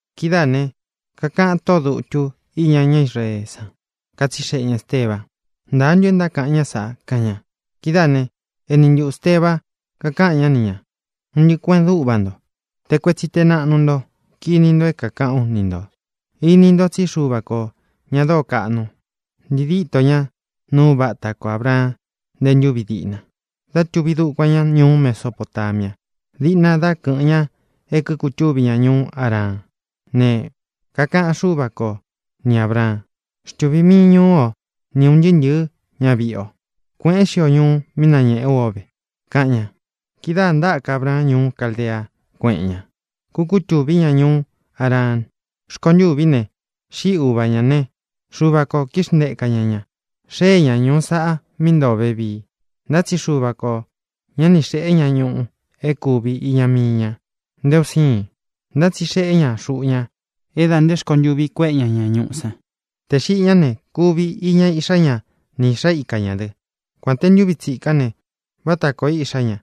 Kidáā ne, kakaꞌan tóꞌō dutu íña ñá Israeé san, katsixeꞌe ña Ēsteba: —¿Ntāa ntu é ntákaꞌan ñá sāꞌa? —kaꞌan ña. Kidáā né, eni ntuꞌu Ēsteba kakáꞌan ñá ni ñā: —Un ntɨꞌɨ kuēꞌen dúꞌva nto, te kuetsi te naꞌnu nto, kini nto é kākaꞌán u ni ntō: Ini nto tsí Xuva kō, ña dóo kaꞌnu, ntii díto ñá nuu uva áta ko Ābraan nte ntúvi diꞌna, dá tūvi dukuan ña ñuú Mesopotamia, diꞌna dá kɨ̄ꞌɨn ña é kikutúvi ña ñuú Haraan. Ne, kakaꞌan Xúva ko ni Ābraan: “Xtuvīn miin ñuú o ni ūn ntɨɨ́ ntɨ̄ɨ́ ñaviꞌi o, kuēꞌén xio ñuu mí nañēꞌé u o ve”, kaꞌan ña. Kidáā ntáka Abraan ñuú Caldea, kuéꞌen ña, kukutuví ñá ñuú Haraan. Rkontûví ne, xíꞌi uva ñā né, Xuva kō kíxnteká ña ña, xee ña ñuu sáꞌa mí ntoo ó vevii. Ntá tsi Xuva kō ñá ni xēꞌé ña ñuꞌu é kūvi iña mii ña, nté un siin. Ntá tsi xeꞌé ña xuꞌu ña é dā nte rkontûvi kuéꞌe ña ña ñuꞌú san. Tē xiꞌi ñá ne, kuvi iña iꞌxá ña ni īꞌxá ika ñā dɨ́, kuān te ntuvi tsíkán ne, váta kōo iꞌxá ña.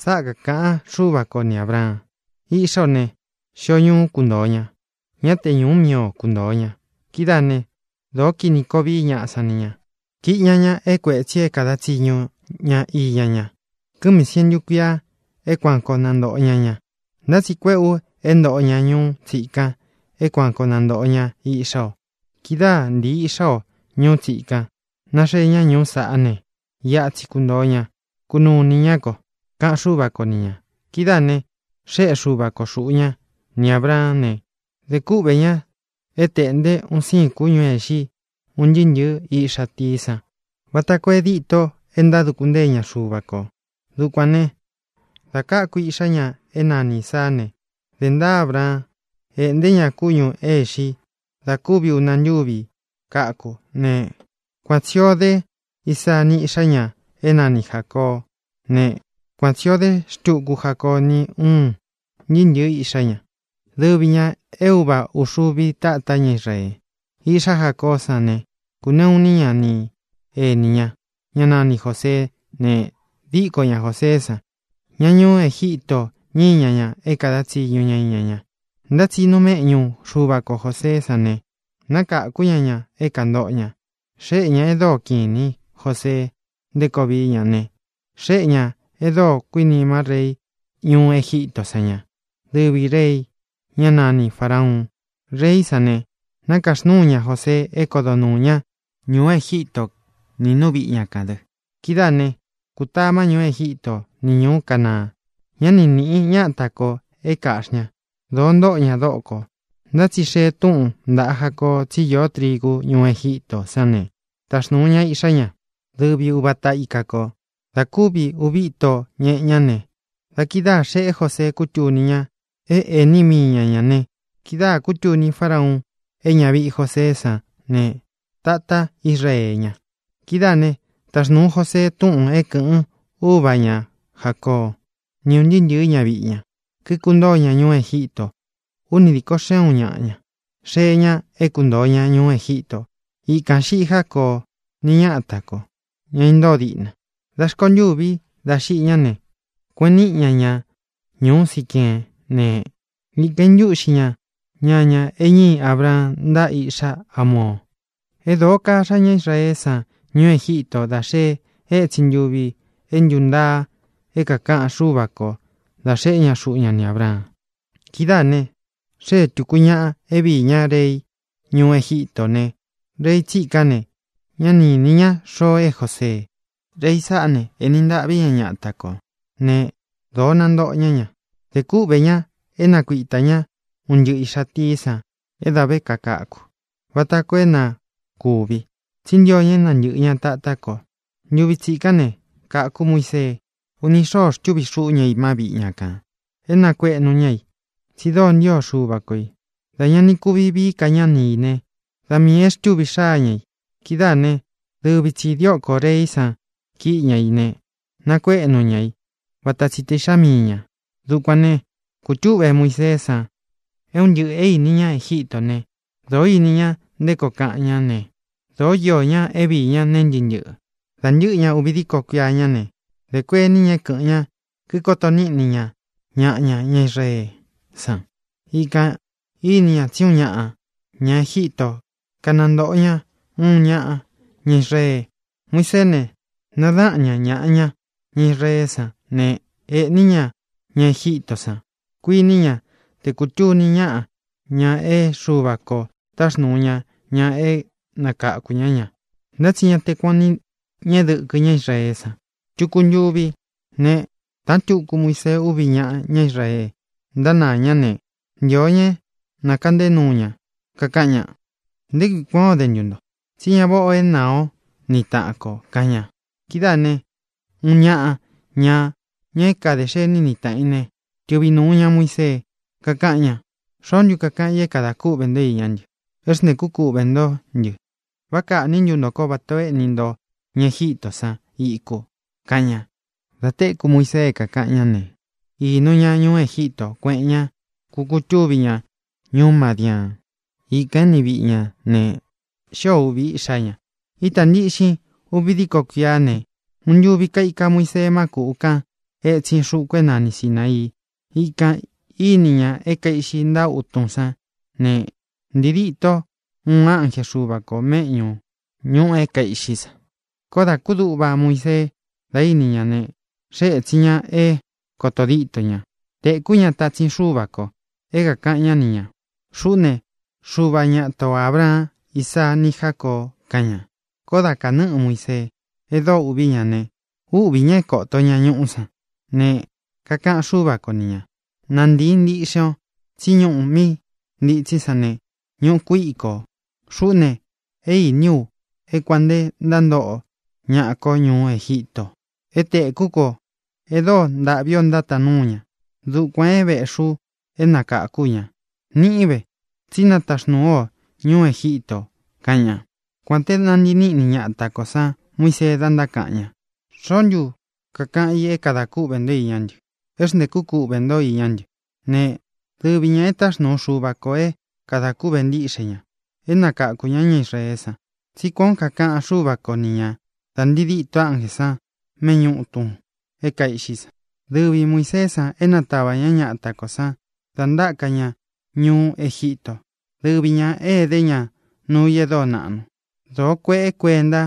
Sáꞌa kākaꞌan Xúva ko ni Ābraan: “Iꞌxá o ne, xio ñuú kuntōo ña; ñá te ñūú mii o kuntoo ña. Kidáā né, dōo kini koo vií ñaꞌa san ni ñā. Kīꞌi ña ña é kuētsi é kāda tsiñu ña iña ña. Kɨ́mī sientu kuia é kuan koo nantōꞌo ña ña. Ntá tsi kuéꞌē u é ntōꞌo ña ñuu tsíkan e kuán koo nantōꞌo ña iꞌxá o. Kidáa ntīi iꞌxá o ñuu tsíkan, naxee ñá ñuu sáꞌa ne, iꞌa tsi kuntoo ña, kunuu inī ñá ko”, kaꞌan Xúva ko ni ñā. Kidáā ne, xéꞌe Xuva ko xuꞌu ña ni Ābraán ne, dē kúꞌvē ña é tēꞌnte un siin kúñū é īxi un ntɨɨ́ ntɨ̄ɨ́ iꞌxa tií san vata koo é dîto e ntáduku ntée ña Xuva kō. Dukuān né, dā káku iꞌxá ña é nani Īsaá ne, dē ntaa Ábraan, éꞌnté ña kúñū é īxi i da kúvi ūna ntúvi káku ne, kuan tsī o dé Isaa ni íꞌxá ña é nani Jācoó ne, kuan tsī o dé xtuku Jacoo ni ún ntɨɨ́ ntɨ̄ɨ́ iꞌxá ña, dɨvi ñā é uva ūxuvi tátá ña Israee. ʼIꞌxá Jacoó san ne, kūneꞌu iní ña ni enī ña, ñá nani Jōseé ne, díko ña Jōseé san. Ña ñuú Egítō ñíi ña ña é kāda tsiñu ñá iña ña. Ntá tsi ínūu méꞌñu Xuva ko Jōseé san ne, nákākú ña ña é kāntoꞌo ña. Xéꞌe ñā e dóo kiꞌin īní Josee nté koo vií ña ne, xéꞌe ñā e dóo kuinima reí ñuú Egítō sán ña, dɨvī rei, ñá nani Farāuun. Reí san ne, nākaxnúu ña Josee é kodo nuū ñá ñuú Egíto nī nú viꞌi ña kān dɨ. ʼKidáā ne, kútama ñuú Egíto ni ñūú Canaan. Ñá ni nīꞌi ñáta kō é kāꞌxi ña. Dōo ntóꞌo ña dókō. Ntá tsi xee túꞌūn ntaꞌa Jacoo tsí īó trigu ñúú Egítō sán ne, táxnūu ña iꞌxá ña, dɨvi uva ata ika kō. Dā kúvi uvi íto ñeꞌe ñá ne, da kidáā xeꞌé Josee kútuni ña é ēni míi ña ñā ne, kidáā kútuni Fárauun é ñaviꞌi Joseé san ne, tatá Israee ña. Kidáā ne, táxnūu Josee túꞌūn é kɨ̄ꞌɨn úva ña Jācoo, ni ún ntɨɨ́ ntɨ̄ɨ́ ñaviꞌi ña, kikuntóo ña ñuú Egítō. Úni dīko xeꞌun ñáꞌa ña xée ña é kuntōo ña ñuú Egítō. Ikān xiꞌí Jacoó ni ñata kō, ña intóo diꞌna. Dā rkontûvi dá xiꞌi ñá ne, kueꞌen níꞌi ña ña ñūú Siqueén ne, ikan īntúꞌxi ña ñaña e ñíi Abraan ntáꞌa iꞌxá Hamoo. ʼE dóo káxa ñá Israeé san ñuú Egítō da xee étsin ntuvi é ntūntaa é kākaꞌan Xúva ko dā xeꞌé ña xuꞌu ña ni Ābraan. Kidáā ne, xée tūku ñaꞌa é viī ñá rei ñuú Egítō ne, rei tsikán ne, ña ni ínī ñá xoo e Jósee. Rei saꞌá ne, ēni ntaꞌví ña ñata kō né, dōo nantóꞌo ña ña. Dē kúꞌvē ña é nakuitā ñá un ntɨꞌɨ īꞌxa tií san é dā ve kakaku vata koo é na kūvi, tsí ntio ña é nantɨ̄ꞌɨ ña tatá kō. Ntuvi tsikán ne, káku Muisee. Uni xóo xtúvi xuꞌu ña i má viꞌi ña kān é nakuēꞌnu ña i, tsi dóo ntio Xuva ko ī. Dā ña ni kuvi vií ka ña ni ī né, da miī é xtuví xaa ña i. Kidáā né, dɨvi tsī diókō reí san kíꞌi ña i ne, nakuéꞌnu ña i vata tsi te iꞌxá mii ñā. Dukuān ne, kutúꞌve Muiseé san é un ntɨꞌɨ̄ é īni ña Egíto ne, dōo íni ña nté koo kaꞌan ñá ne, dōó iō ña é viī ñá nee ntɨ́ꞌɨ ntɨꞌɨ. ʼDā ntɨꞌɨ ña uvi díko kuiá ña ne, dē kuení ña é kɨ̄ꞌɨn ña, kikoto níꞌni ña ñaꞌa ña, ña Israeé san. Ikān íni ña tsí uun ñaꞌa ña Egíto kanantōꞌo ña uun ñaꞌa ña Israee. Muiseé ne, nadáꞌan ña ñāꞌa ña, ña Israeé san ne, ēꞌní ña ña Egítō san. Kuiní ña té kūtuni ñaꞌa ña é Xuva kō táxnūu ña ña é nakákū ñá ña. Ntá tsi ñá te kuan ō ni ñeꞌe dɨ́kɨ ña Israeé san. Tuku ntuvi ne, taꞌan túku Muisee úvi ñaꞌa ñá Israee, ntánaā ñá ne, ntio ña é nakaꞌnté nuu ña, kakaꞌan ña: “¿Nté kui kuān ó de ntu nto? Tsí ñá vāꞌá ō é naa o ni taꞌan kō”, kaꞌan ña. Kidáā ne, uun ñaꞌa ña, ña é kadē xení ni tāꞌan i ne, tɨꞌvi nūu ña Muisee, kakáꞌan ña: “¿Xoó ntu kakaꞌan i é kadā kúꞌvē nto iñá ntɨ, é xntēkú kuꞌvē ntó ntɨ? ¿Vá kaꞌnī ntú nto ko vata ō éꞌni nto ña Egítō san iku?”, kaꞌan ña. Dā téku Muisee é kākaꞌan ñá ne, īnu ña ñuú Egítō, kuéꞌen ña, kukutúvi ñá ñuú Madiaan. Ikān éni viꞌi ña ne, xío ūvi iꞌxá ña. ʼÍtā ntiꞌxin uvi díko kuiá ne, uun ntuvi kaika Muisee má kūꞌu kan etsin xuku é nani Sināii. Ikān íni ñá é kaīꞌxi ntáꞌa utun sán ne, ntii díto uun ánje Xuva kō méꞌñū ñuꞌu é kaīꞌxí san. Koó dā kúduꞌva Muisee da íni ña ne, xée ētsin ña é koto díto ña. Tēkú ña tatsin Xúva kō é kākaꞌan ñá ni ñā: “Xuꞌú ne, Xuva ñáta o Ābraan, Ísaa, ni Jácoo”, kaꞌan ña. Koó dā kanɨ́ꞌɨ Muisee e dóo ūꞌví ña ne, úꞌvī ñá é kōto ña ñuꞌu san. Ne, kakaꞌan Xúva ko ni ñā: “Nantīin ntiꞌxen o, tsí ñuꞌu mí ntītsín san ne, ñuꞌu kuîko. Xuꞌú ne, é iní u é kuān nte ntántóꞌo ñaꞌa ko ñuú Egítō. É tēkú ko e dóo ntaꞌví o ntátaan nuu ña. Dukuān é vēꞌxi ú é nakākú u ña. Niꞌín ve, tsí nataxnūu ú o ñuú Egítō”, kaꞌan ña. ʼKuān te nántii niꞌni ñata kō san Muisee dá ntákaꞌan ña: “¿Xoó ntu kakaꞌan i é kadā kúꞌvē nto iñá ntɨ, é xntēkú kuꞌvē ntó iñá ntɨ?”, ne, dɨvi ñā é taxnuu Xuva kō é kadā kúꞌvē ntíꞌxe ña, é nakakū ñá ña Israeé san, tsí kuān ó kakaꞌan Xúva ko ni ñā da ntii dîto ánjē san méꞌñu ūtun é kaīꞌxí san. Dɨvi Muīseé san é nátava ña ñata kō san da ntáka ña ñuú Egítō. Dɨvi ñā e dé ña nuu i e dóo naꞌnu. Dōo kueꞌe kuénta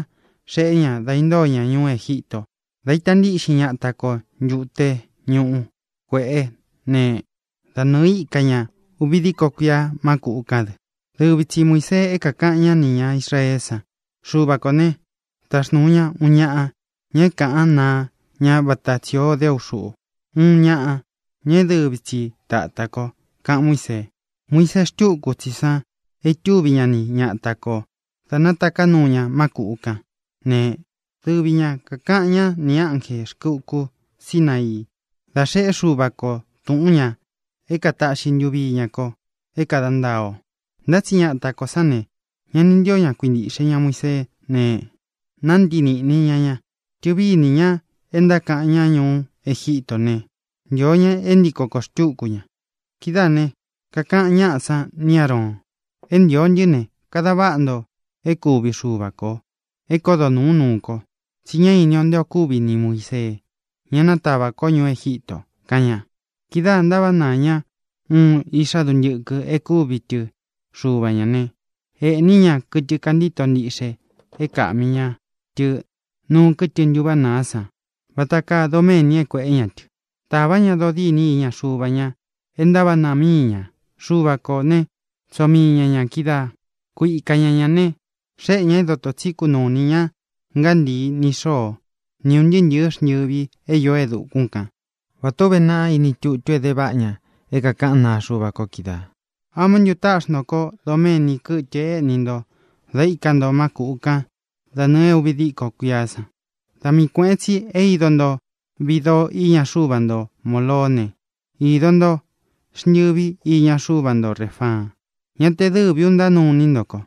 xeꞌé ña dā intóo ña ñuú Egíto, dā ita ntíꞌxin ñata ko Ntute Ñuꞌu Kuēꞌé ne, da nɨɨ̄ íka ña uvi díko kuia má kūꞌu kán dɨ. Dɨvi tsi Muīsee é kākaꞌan ñá nī ña Israeé san: “Xuva ko ne, taxnūu ña uun ñaꞌa, ña é kaꞌán naa ña vata tsī ó de ú xuꞌu, uun ñaꞌa, ña é dɨvi tsi tāta ko”, kaꞌan Muísee. Muisee xtúku tsi san é itúvi ña ni ñata kō da nátaká nuu ña má kūꞌu kán ne, dɨvi ña kākaꞌan ñá nī ánjē rkɨ uku Sínaii da xeꞌé Xuva kō túꞌun ñā é kātaꞌxi ntuvi iña ko é kāda ntaa o. ʼNtá tsi ñata kō sán ne, ña ni ntío ña kuintīꞌxe ña Muiseé ne, nántii nīꞌni ña ña. Tɨ̄vi ínī ña e ntáka ña ñuú Egíto ne, ntīo ña é ntiko kōo xtúku ña. Kidáā né, kakaꞌan ñáꞌa sán ni Āroon: “É ntīo ntɨ́ ne, kāda váꞌa nto é kūvi xuva ko, é kodo nūú nuu ko, tsí ñá ini o nté ō kúvi ni Muīsee, ñá natavā ko ñuú Egítō”, kaꞌan ña. Kidáā ntaváꞌa naā ñá uun iꞌxá duntɨkɨ e kúvi tɨ xuva ñā né, ēꞌní ña kɨtɨ kantíto ntiꞌxe é kāꞌmi ña tɨ nuu kɨ́tɨ ntuváꞌa nāá san vata kaa doméni é kuēꞌé ña tɨ. Tāvá ña dodîni iña xuva ñā e ntaváꞌa nāa míi ña. Xuva kō né, tsoo mii ña ñā kídaa, ku ika ña ñā ne, xéꞌe ñā é dotō tsí kunuu inī ña ngántii ni xoo ni ūn ntɨɨ́ ntɨ̄ɨ́ xntɨvi é īó e dukún kan, vatā ó uve naꞌa iní tutu é de váꞌa ña é kākaꞌán naa Xuva ko kídaā: ¿Amá ntu táꞌxi nto kó doméni kɨtɨ éꞌni nto da íka nto má kuꞌu kan da nɨɨ̄ é ūvi díko kuiá san? Da mii kuēꞌen tsi é ido nto viꞌi doo iña xuva nto Moloó ne, īdo nto xntɨvi iña xuva nto Refaan. Ñá te dɨvī ú ntánuu iní nto ko,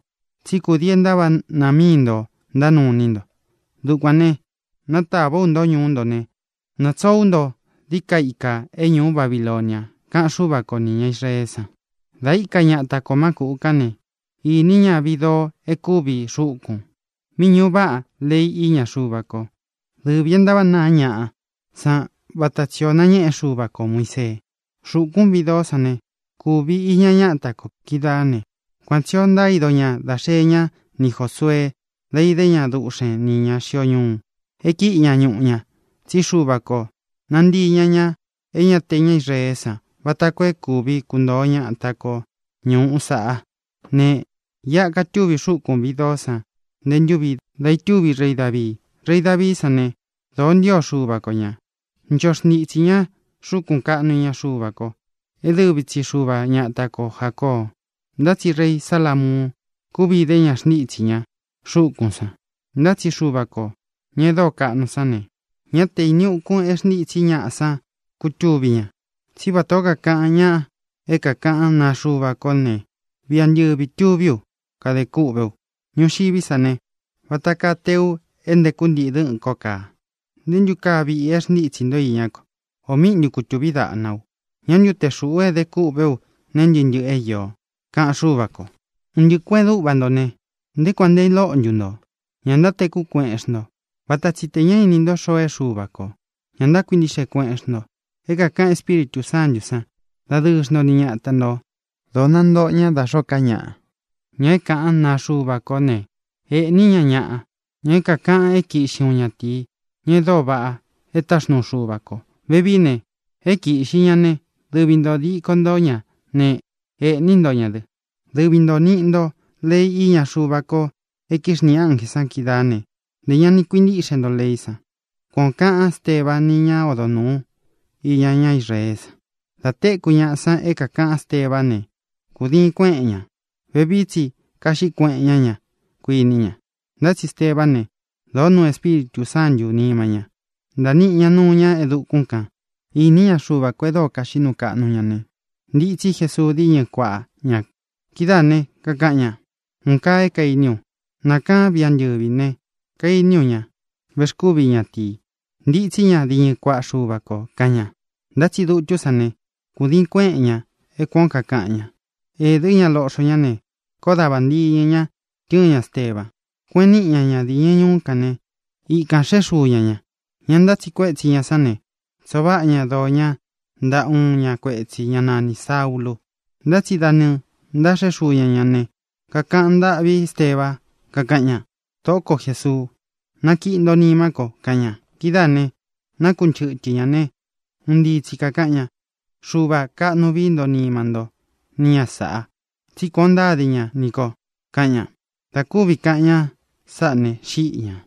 tsí kudii e ntávaꞌa nāa mií nto ntánuu iní nto. Dukuān né, natāvá u nto ñuú nto ne, natsoo ú nto dií ka ikā é ñuú Babilonia, kaꞌan Xúva ko nī ña Israeé san. ʼDā íka ñata kō má kūꞌu kán ne, ínīꞌi ñá viꞌi doo e kúvi xúkūn, mí ñuꞌu váꞌa lei iña Xuva ko, dɨvī é ntávaꞌa nāá ñaꞌa san vata tsi ō nañéꞌe Xuva kō Muisee. Xúkūn viꞌi doó san ne, kuvi iña ñáta kō kídaa ne, kuan tsī ó ntaído ñā dá xee ñá ni Jōsuee dá idé ña duꞌxen nī ña xio ñuu, é kíꞌi ña ñuꞌu ña, tsí Xuva kō nantii ña ña é ña te ña Israeé san vata koo é kūvi kuntoó ñata ko ñūú saꞌa. Ne, iꞌa katúvi xúkūn viꞌi doó san nté ntūvi dá itúvi rei Davii. Rei Davií san ne, dōó ntio Xuva ko ñā. Ncho xntitsī ñá xúkun kāꞌnu iña Xuva ko, é dɨvi tsi Xuva ñata ko Jācoo; ntá tsi rei Salamuun kúvi idé ña xntítsī ñá xúkūn san. Ntá tsi Xuva kō, ña e dóo kaꞌnu sán ne, ñá te īni ukun e xntítsī ñaꞌa san kutuví ña. Tsí vatā ó kakaꞌan ña é kākaꞌán naa Xuva kó ne: Viꞌi antɨvi ā tuví u, kadē kûꞌvé u. Ñuxiví san ne, vata kaa teu é nteku ntiꞌi dɨ̄ꞌɨn ko kaa. ¿Nté ntu kaa viꞌi é xntitsi ntō iñá ko? ¿Ō míꞌi ntu kūtuví daꞌna u? ¿Ñā ntu te xúꞌu e dé kûꞌvé u neé ntɨꞌɨ ntɨꞌɨ é īo? kaꞌan Xúva kō. ʼUn ntɨꞌɨ kuēꞌen dúꞌva nto ne, ¿nté kuān nte lóꞌo ntu nto? ¿Ña ntátekú kueꞌen xnto? Vata tsi tē ña íni nto xoo é Xuva kō. Ñá ntákuintiꞌxe kueꞌen xnto é kākaꞌan Espíritū Sántū san. Dadɨɨ xnto ni ñata ntō. Dōo nantóꞌo ña da xōó ka ñaꞌa, ña é kaꞌán naa Xuva kó ne, ēꞌní ña ñaꞌa, ña é kākaꞌan é kiꞌxi uun ñatīí, ña e dóo vaꞌa é taxnuu Xuva kō. Vevií ne, é kīꞌxi ñá ne, dɨvi ntō díko nto ñā né, ēꞌní nto ña dɨ. Dɨvi ntō niꞌi ntó lei iña Xuva ko e kíxniꞌi ánjē san kídaa ne, ntē ña ni kuintíꞌxe nto leí san. —Kuan ō kaꞌan Ésteba ni ñá odo nūu iña ñá Israeé san. Dā téku ñaꞌa san é kākaꞌan Éstebá ne, kūdiin kuéꞌen ña. Vevií tsi kaꞌxí kueꞌen ñá ña, kuiní ña. Ntá tsi Estebá ne, dōo nuu Espíritū Sántū nima ña. Ntāa niꞌi ña nuu ñá e dukún kan, īní ña Xuva kō e dóo kaxiꞌí nuu kaꞌnu ña ne, ntitsí Jesuu díñɨ kuaꞌa ña. Kidáā né, kakaꞌan ña: —¡Un kaa é kainí u! Nākaán viꞌi antɨ̄vi ne, kainí u Ña Vexkúvi Ñatīi, ntitsí ña diñɨ kuaꞌa Xuva kō —kaꞌan ña. Ntá tsi dutú san ne, kūdiin kuéꞌen ña é kuān ó kakaꞌan ña. Ēdɨ́ ña loꞌxo ñá ne, koó da vāntiñɨ ña tɨ́ɨn ña Esteba, kueꞌen níꞌi ña ña diñɨ ñuú kān né, ikān xeꞌé xuu ña ñā. Ña ntátsiꞌi kuétsi ñā sán ne, tsoo váꞌa ña doo ña ntaꞌa uun ná kuetsī, ná nanī Saúlū. Ntá tsi, da nɨɨ̄ ntáxeꞌé xuu ña ñā ne, kakaꞌan ntâꞌví Esteba, kakaꞌan ña: —Tōꞌó ko Jesuu, nakiꞌi nto nimá ko —kaꞌan ña. Kidáā ne, nakunchɨ́tɨ ña ne, un ntii tsi kākaꞌan ña: —¡Xuvā, kaꞌnu vií nto nima ntó ni ña sāꞌa tsí kuān ó ntáde ña nī ko! —kaꞌan ña. Dā kúvi kaꞌan ña sáꞌa ne, xíꞌi ñā.